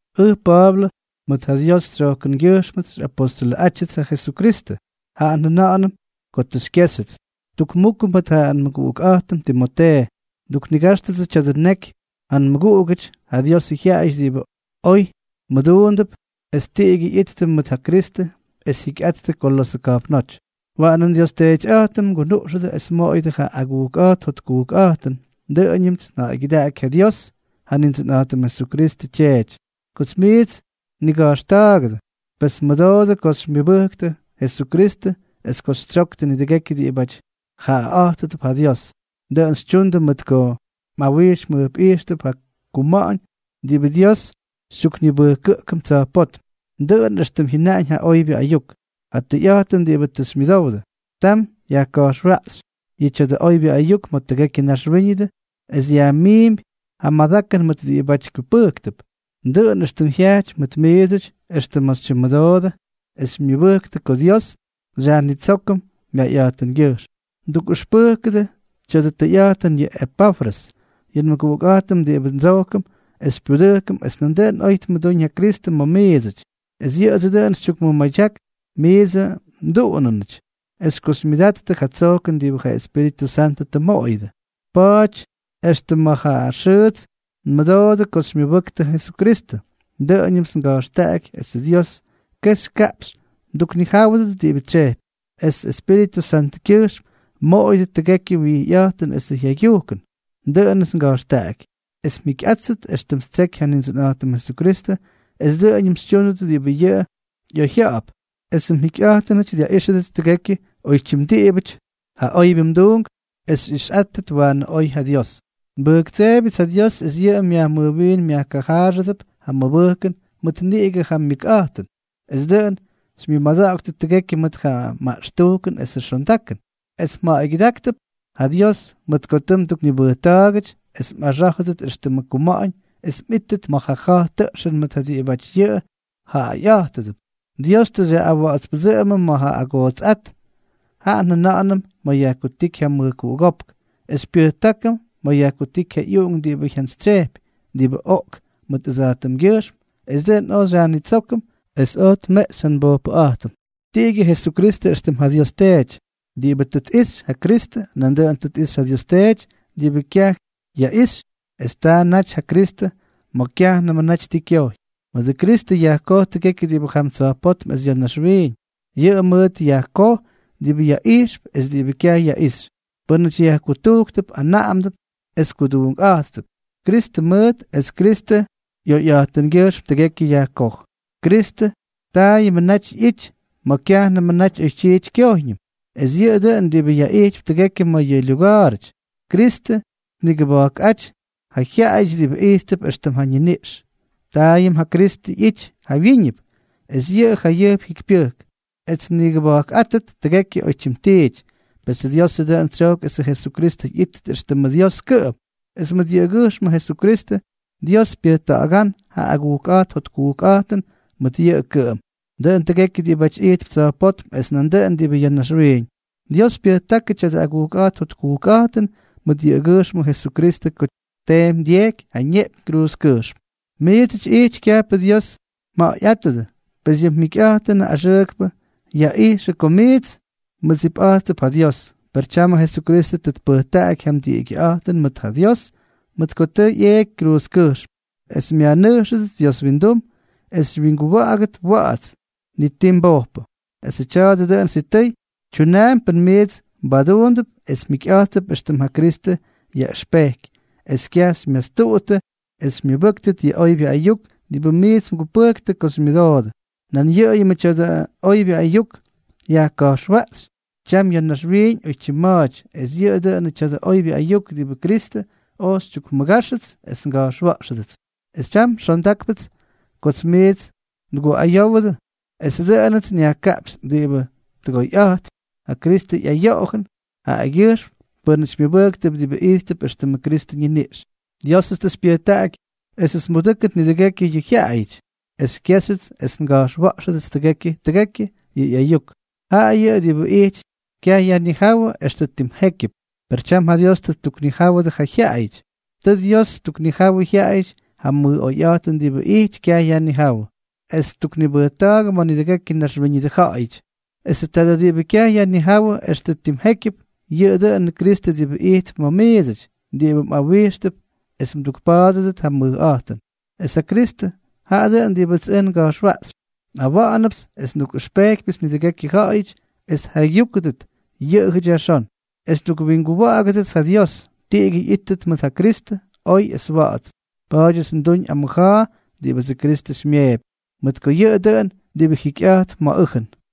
Ʉj Pa̱a̱blʉ, mʉt ja Dios tsyojkʉngyʉjxmʉts xyꞌapostʉlʉꞌátyʉts ja Jesukristʉ, jaꞌa njʉna̱ꞌa̱nʉm ko tʉ xykyéxyʉts. Tukmukʉ mʉt ja nmʉguꞌukꞌa̱jtʉm Timotee, nduknigáxtʉdsʉ tya̱dʉ neky ja nmʉguꞌugʉty, ja Diosʉ jyaꞌayʉty diꞌibʉ oy muduunʉp es tiꞌigyʉ ꞌyittʉ mʉt ja Kristʉ es jyikyꞌattʉ Kolosʉ ka̱jpnóty. Waꞌanʉ nDios Teetyꞌa̱jtʉm mgunuꞌxʉdʉ es mmoꞌoyʉdʉ ja agujkꞌa̱jt jotkujkꞌa̱jtʉn. Dʉꞌʉñʉmts nja̱ꞌa̱ygyʉdaꞌaky ja Dios, ja Nindsʉnꞌa̱jtʉm Jesukristʉ Tyeety, kots miits nniga̱jxta̱a̱gʉdʉ, pes nmʉdoodʉ ko xymyʉbʉktʉ Jesukristʉ es ko xytsyoktʉ nidʉgekyʉ diꞌibáty jaꞌaꞌa̱jtʉdʉp ja Dios. Dʉꞌʉn xytyundʉ mʉt ko mꞌawijx mjʉjpꞌijxtʉp ja kuma̱ꞌa̱ñ diꞌibʉ Dios xytyuknibʉjkʉꞌkʉm tsa̱jpótm, dʉꞌʉn éxtʉm jyʉnaꞌañ ja oybyʉ ayuk, ja tʉyꞌa̱jtʉn diꞌibʉ tʉ xymyʉdowdʉ. Tam yajka̱jxwaꞌxy yʉ tya̱dʉ oybyʉ ayuk ma̱ tʉgekyʉ naxwíñʉdʉ, es yajmiimpy ja madakʉn mʉt diꞌibáty kyupʉjktʉp, dʉꞌʉn éxtʉm jyajty mʉt miidsʉty extʉ ma̱ xytyimmʉdoodʉ es xymyʉbʉjktʉ ko Dios xyajnitsókʉm myayꞌa̱jtʉngyʉjxm. Mdukꞌʉxpʉjkʉdʉ tya̱dʉ tʉyꞌa̱jtʉn yʉ Epafrʉs, yʉ nmʉguꞌukꞌa̱jtʉm diꞌibʉ ndsojkʉm es xypyudʉjkʉm es nandʉꞌʉn oy tmʉdúñ ja Kristʉ ma̱ miidsʉty. Es yʉꞌʉdsʉ dʉꞌʉn xytyukmʉmadyak miidsʉ mduꞌunʉnʉty es ko xymyʉdattʉ ja tsojkʉn diꞌibʉ ja Espíritʉ Santʉ tʉ mmoꞌoyʉdʉ. Pa̱a̱ty extʉm ma̱ ja xʉʉts nmʉdoodʉ ko xymyʉbʉktʉ Jesukristʉ, dʉꞌʉñʉmts nga̱jxtaꞌaky esʉ Dios kexy kaꞌpxy mduknijáwʉdʉt diꞌibʉ tsyejpy, es Espíritʉ Santʉkyʉjxm mmoꞌoyʉdʉt tʉgekyʉ wijyꞌa̱jtʉn esʉ jaygyujkʉn. Dʉꞌʉnʉts nga̱jxtaꞌaky es mjikyꞌáttʉt éxtʉm ttseky ja Nindsʉnꞌa̱jtʉm Jesukristʉ, es dʉꞌʉñʉm xytyúndʉt diꞌibʉ yʉꞌʉ ꞌyoyjya̱ꞌa̱p, esʉ mjikyꞌa̱jtʉnʉty dyaꞌíxʉdʉt tʉgekyʉ oytyim diꞌibʉty ja oybyʉ mduunk, es xyꞌixyꞌátʉt waanʉ oy ja Dios. Nbʉjktseebyʉts ja Dios es yʉꞌʉ myajmʉjwiin myajkajaaxʉdʉp ja mmʉbʉjkʉn mʉt niꞌigʉ ja myʉkꞌa̱jtʉn, es dʉꞌʉn xymyʉmada̱ꞌa̱ktʉt tʉgekyʉ mʉt ja maꞌxtujkʉn esʉ xondakʉn, es mja̱ꞌa̱ygyʉda̱ꞌa̱ktʉp ja Dios mʉt ko tʉ mduknibʉjta̱a̱gʉty es mꞌaxá̱jʉdʉt éxtʉmʉ kuma̱ꞌa̱ñ es mꞌíttʉt ma̱ ja ja̱j tʉꞌxʉn mʉt ja diꞌibáty yʉꞌʉ jaꞌaꞌa̱jtʉdʉp. Dios tʉ xyaꞌꞌawa̱ꞌa̱tspʉdsʉꞌʉmʉm ma̱ ja agootsꞌát, jaꞌa njʉna̱ꞌa̱nʉm ma̱ yajkutíky ja mʉjkuꞌugópk, es xypyʉjtákʉm ma̱ yajkutíky ja ꞌyUꞌunk diꞌibʉ jyantsytsyejpy, diꞌibʉ oꞌk mʉt ʉdsa̱jtʉmgyʉjxm es dʉꞌʉn oj xyajnitsókʉm es oj tmeꞌxy ja nbojpʉꞌa̱jtʉm. Tiꞌigyʉ Jesukristʉ éxtʉm ja Dios Teety. Diꞌibʉ tʉ tꞌixy ja Kristʉ, nandʉꞌʉn tʉ tꞌixy ja Dios Teety diꞌibʉ kyaj yaꞌixy; es taa naty ja Kristʉ ma̱ kyajnʉmʉ naty ti kyojy. Mʉdʉ Kristʉ yajkoj tʉgekyʉ diꞌibʉ jam tsa̱jpótm es ya̱ naxwiiñ. Yʉꞌʉ mʉʉt yajkoj diꞌibʉ yaꞌijxp es diꞌibʉ kyaj yaꞌixy, pʉ́nʉty yajkutujktʉp, anaꞌamdʉp es kuduunkꞌa̱jttʉp. Kristʉ mʉʉt es Kristʉ ꞌyoyꞌa̱jtʉngyʉjxm tʉgekyʉ yajkoj. Kristʉ taayʉmʉ naty ꞌyity ma̱ kyajnʉmʉ naty oytyiity kyojyñʉm, es yʉꞌʉ dʉꞌʉn diꞌibʉ yaꞌijtypy tʉgekyʉ ma̱ yʉ lyuga̱a̱rʉty. Kristʉ tnigʉba̱jkꞌáty yʉ jyaꞌayʉty diꞌibʉ ijttʉp éxtʉm ja ñiniꞌx. Taayʉm ja Kristʉ ꞌyity jawyíñʉp, es yʉꞌʉ jayʉjp jikypyʉjk, es tnikʉba̱jkꞌátʉt tʉgekyʉ oytyim tiity. Pesʉ Diosʉ dʉꞌʉn tsyojk esʉ Jesukristʉ ꞌyítʉt éxtʉmʉ Dios kʉꞌʉm, es mʉt yʉꞌʉgyʉjxmʉ Jesukristʉ, Dios pyʉjta̱ꞌa̱gán ja agujkꞌa̱jt jotkujkꞌa̱jtʉn mʉt yʉꞌʉ kʉꞌʉm, dʉꞌʉn tʉgekyʉ diꞌibáty ijtp tsa̱jpótm es nandʉꞌʉn diꞌibʉ ya̱ naxwiiñ. Dios pyʉjtákʉ tya̱dʉ agujkꞌa̱jt jotkujkꞌa̱jtʉn mʉt yʉꞌʉgyʉjxmʉ Jesukristʉ ko tteemy dyejky ja ñeꞌpyñ kruuzkʉjxm. Miidsʉty ijty kyajpʉ Dios mja̱ꞌa̱yꞌátʉdʉ, pes yʉ mjikyꞌa̱jtʉnʉ axʉʉkpʉ yaꞌijxʉ ko miits mmʉdsipꞌa̱jttʉp ja Dios; per tyamʉ Jesukristʉ tʉ tpʉjtaꞌaky ja mdiꞌigyʉꞌa̱jtʉn mʉt ja Dios, mʉt ko tʉ ꞌyeeky kruuzkʉjxm es myajnʉjxʉdʉt Dios windum, es xywyinguwa̱ꞌa̱gʉdʉt wa̱ꞌa̱ts, ni tiijʉ mbojpʉ. Esʉ tya̱a̱dʉ dʉꞌʉn sitʉy tyunaampy pʉn miits mbaduundʉp es mjikyꞌa̱jttʉp éxtʉm ja Kristʉ yaꞌʉxpejky, es kyaj xymyastuꞌuttʉ es xymyʉbʉ́ktʉt yʉ oybyʉ ayuk diꞌibʉ miits mgupʉjktʉ ko xymyʉdoodʉ. Nan yʉꞌʉyʉmʉ tya̱dʉ oybyʉ ayuk yajka̱jxwaꞌxy tyam ya̱ naxwiiñ oytyim ma̱a̱ty, es yʉꞌʉ dʉnʉ tya̱dʉ oybyʉ ayuk diꞌibʉ Kristʉ oj xytyukmʉgáxʉts es nga̱jxwa̱ꞌxʉdʉts. Es tyam xondákpʉts kots miits nguꞌayówʉdʉ, esʉ dʉꞌʉnʉts nyajkaꞌpxy diꞌibʉ tʉgoyꞌa̱jtp ja Kristʉ ꞌyayoꞌojʉn jaꞌagyʉjxm pʉ́nʉty myʉbʉjktʉp, diꞌibʉ ijttʉp éxtʉmʉ Kristʉ ñiniꞌx. Diósʉts tʉ xypyʉjtaꞌaky esʉts nbudʉ́kʉt nidʉgekyʉ yʉ jyaꞌayʉty, es xykyejxyʉts es nga̱jxwa̱ꞌxʉdʉts tʉgekyʉ tʉgekyʉ yʉ ꞌyayuk, jaꞌa yʉꞌʉ diꞌibʉ ijty kyayajnijáwʉ extʉ tim jékyʉp, per tyam ja Dios tʉ ttuknijáwʉdʉ ja jyaꞌayʉty. Tʉ Dios ttuknijawʉ jyaꞌayʉty ja mʉj oyꞌa̱jtʉn diꞌibʉ ijty kyayajnijáwʉ, es ttuknibʉjta̱a̱gʉ ma̱ nidʉgekyʉ naxwíñʉdʉ ja̱ꞌa̱yʉty. Esʉ tadʉ diꞌibʉ kyaj yajnijáwʉ extʉ timjékyʉp, yʉꞌʉ dʉꞌʉnʉ Kristʉ diꞌibʉ ijtp ma̱ miidsʉty, diꞌibʉ mꞌawijxtʉp es mdukpa̱a̱dʉdʉt ja mʉjꞌa̱jtʉn. Es ja Kristʉ, jaꞌa dʉꞌʉn diꞌibʉts ʉj nga̱jxwaꞌxypy. Nꞌawa̱ꞌa̱nʉpts es ndukꞌʉxpejkypyʉts nidʉgekyʉ ja̱ꞌa̱yʉty es tjaygyúkʉdʉt yʉꞌʉjʉty yajxón, es ndukwinguwa̱ꞌa̱gʉdʉts ja Dios, tiꞌigyʉ ꞌyíttʉt mʉt ja Kristʉ, oy es wa̱ꞌa̱ts. Pa̱a̱dyʉts nduñ amʉja̱a̱ diꞌibʉdsʉ Kristʉ xymyeepy, mʉt ko yʉꞌʉ dʉꞌʉn diꞌibʉ jikyꞌa̱jtp ma̱ ʉjʉn.